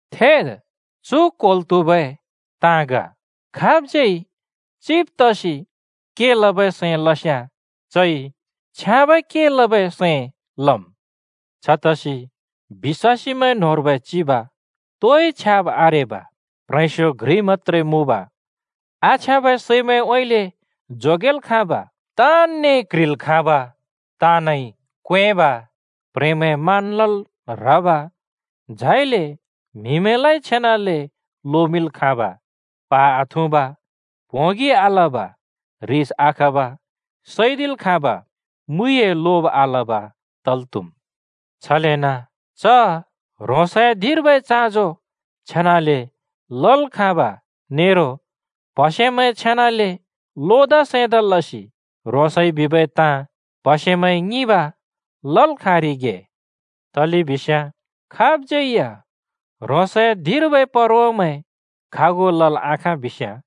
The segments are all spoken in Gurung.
थेद्, चु क्वेंल् त्‍हुबै ताँ ग: खाबज्यै चिब तसि के लबै सैं लस्‍याँ चइ छ्याँबै के लबै सैं लम्। छतसि बिश्‍वासीमैं न्होंर्बै चिब तोइ छ्याब् आरेब, प्ह्रेंस्यो घ्रि मत्‍त्रे मुँब, आछ्याँबै सैमैंउँइँले जोगेल् खाँब, ताँनने क्ह्रिल् खाँब, ताँनइ क्वेंब, प्ह्रेंमैं मान लल् ह्रब, झाइले म्हिमैं छेनाले लोमिंल् खाँब, प्हा आथुँब, प्होंगि आलब, ह्रिस आखब, सैदिल् खाँब, मुइए लोब आलब तल् त्हुम्। छलेन च ह्रोंसए धिंर्बै चाँजो छेनाले लल् खाँब नेरो प्हसेमैं छेनाले लोदा सैंदा लसि ह्रोंसइ बिबै ताँ प्हसेमैंइ ङिंब लल् खाँरिगे। तलेबिस्याँ खाबज्यै या ह्रोंसए धिंर्बै परवामैं खागु लल् आखाँ बिस्‍याँ,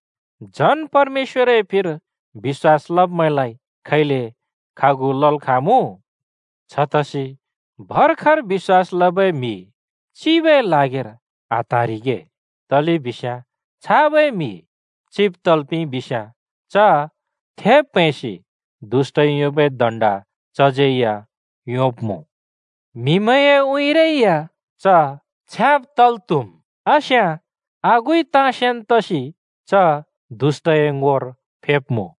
झन् परमेश्‍वरए फिर बिश्‍वास लब्मैंलाइ खैले खागु लल् खाँमुँ? छतसि भर्खर बिश्‍वास लबै म्‍हि चिबए ल्हागिर आत्हाँरिगे, तलेबिस्याँ छाबै म्‍हि चिब तल् पिंइबिस्‍याँ, च थेब् प्हैंसि दुष्‍टइ योंबै दण्ड चज्यै या योंब्‍मुँ। म्हिमैंए उँइँरै या च छ्याँब तल् त्हुम्, आस्याँ आगुइ ताँ सेन् तसि च दुष्‍टए ङोर फेब्मुँ।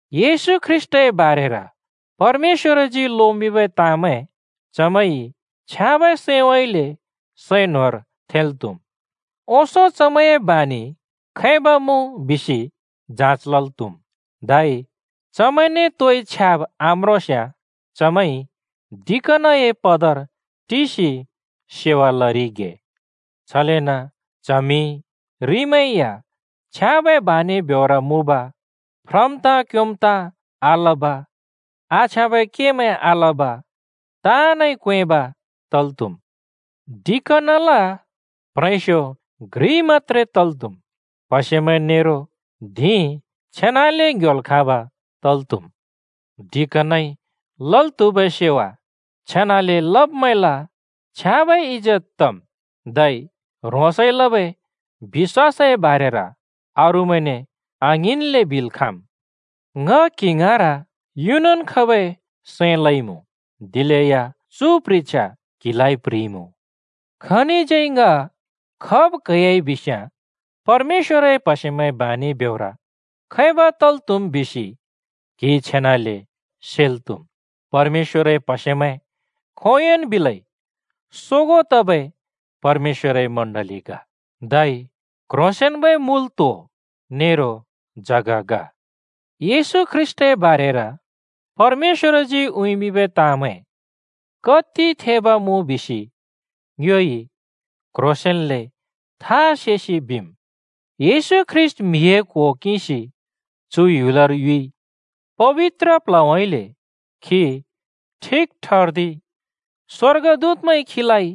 येशू ख्रीष्‍टए बारेर परमेश्‍वरजी लोमिंबै ताँमैं चमैंइ छ्याँबै सैंउँइँले सैं न्होंर थेंल् त्‍हुम्। ओंसों चमैंए बानि खैब मुँ बिसि जाँच लल् त्हुम्, धै चमैंने तोइ छ्याब् आम्रोंस्याँ चमैंइ डिकनए पदर टिसि सेवा लरिगे। छलेन च्हमि-रिमैं या छ्याँबै बानि ब्योर मुँब, फ्रम् ताँ क्योंम् ताँ आलब, आछ्याँबै केमैं आलब, ताँनइ क्वेंब तल् त्‍हुम्। डिकनल प्ह्रेंस्यो घ्रि मत्‍त्रे तल् त्‍हुम्। प्‍हसेमैं नेरो धिं छेनाले ङ्‍ह्‍योल् खाँब तल् त्‍हुम्। डिकनइ लल् त्हुबै सेवा छेनाले लब्मैंल छ्याँबै इजेत तम्, धै ह्रोंसइ लबै बि‍श्‍वासए बारेर अरूमैंने आङ्हिंन्ले बिल् खाँम्। ङ क्‍हि ङाँर युनन् खबै सैं लइमुँ, दिलेया चु प्ह्रिछ्या क्हिलाइ प्ह्रिइमुँ। खनिज्यै ङ खब क्हैयाइ बिस्याँ परमेश्‍वरए प्हसेमैंए बानि ब्योर खैब तल् त्‍हुम् बिसि क्हिइ छेनाले सेल् त्हुम्। परमेश्‍वरए प्हसेमैं खोंयोंन् बिलै सोगों तबै परमेश्‍वरए मण्‍डलि ग, धै क्ह्रोंसेंन्बै मुल त्हो नेरो जग ग। येशू ख्रीष्‍टए बारेर परमेश्‍वरजी उँइँमिंबै ताँमैं कति थेब मुँ बिसि ङ्योइ क्ह्रोंसेंन्ले थहा सेसि बिम्: येशू ख्रीष्‍ट म्‍हिए क्हो किंसि चु ह्‍युलर युइ, पबित्र प्ल्हउँइँले खी ठिक ठर्दिइ, स्वर्गदूतमैंइ खीलाइ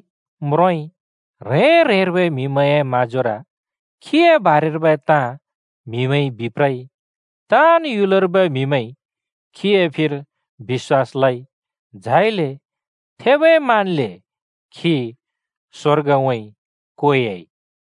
म्रोंइ, ह्रें ह्रेंर्बै म्‍हिमैंए म्हाँजोर खीए बारेर्बै ताँ म्हिमैंइ बिप्रइ, ताँन् ह्‍युलर्बै म्‍हिमैंइ खीए फिर बिश्‍वास लइ, झाइले थेबै मानले खी स्‍वर्गउँइँ क्वेयाइ।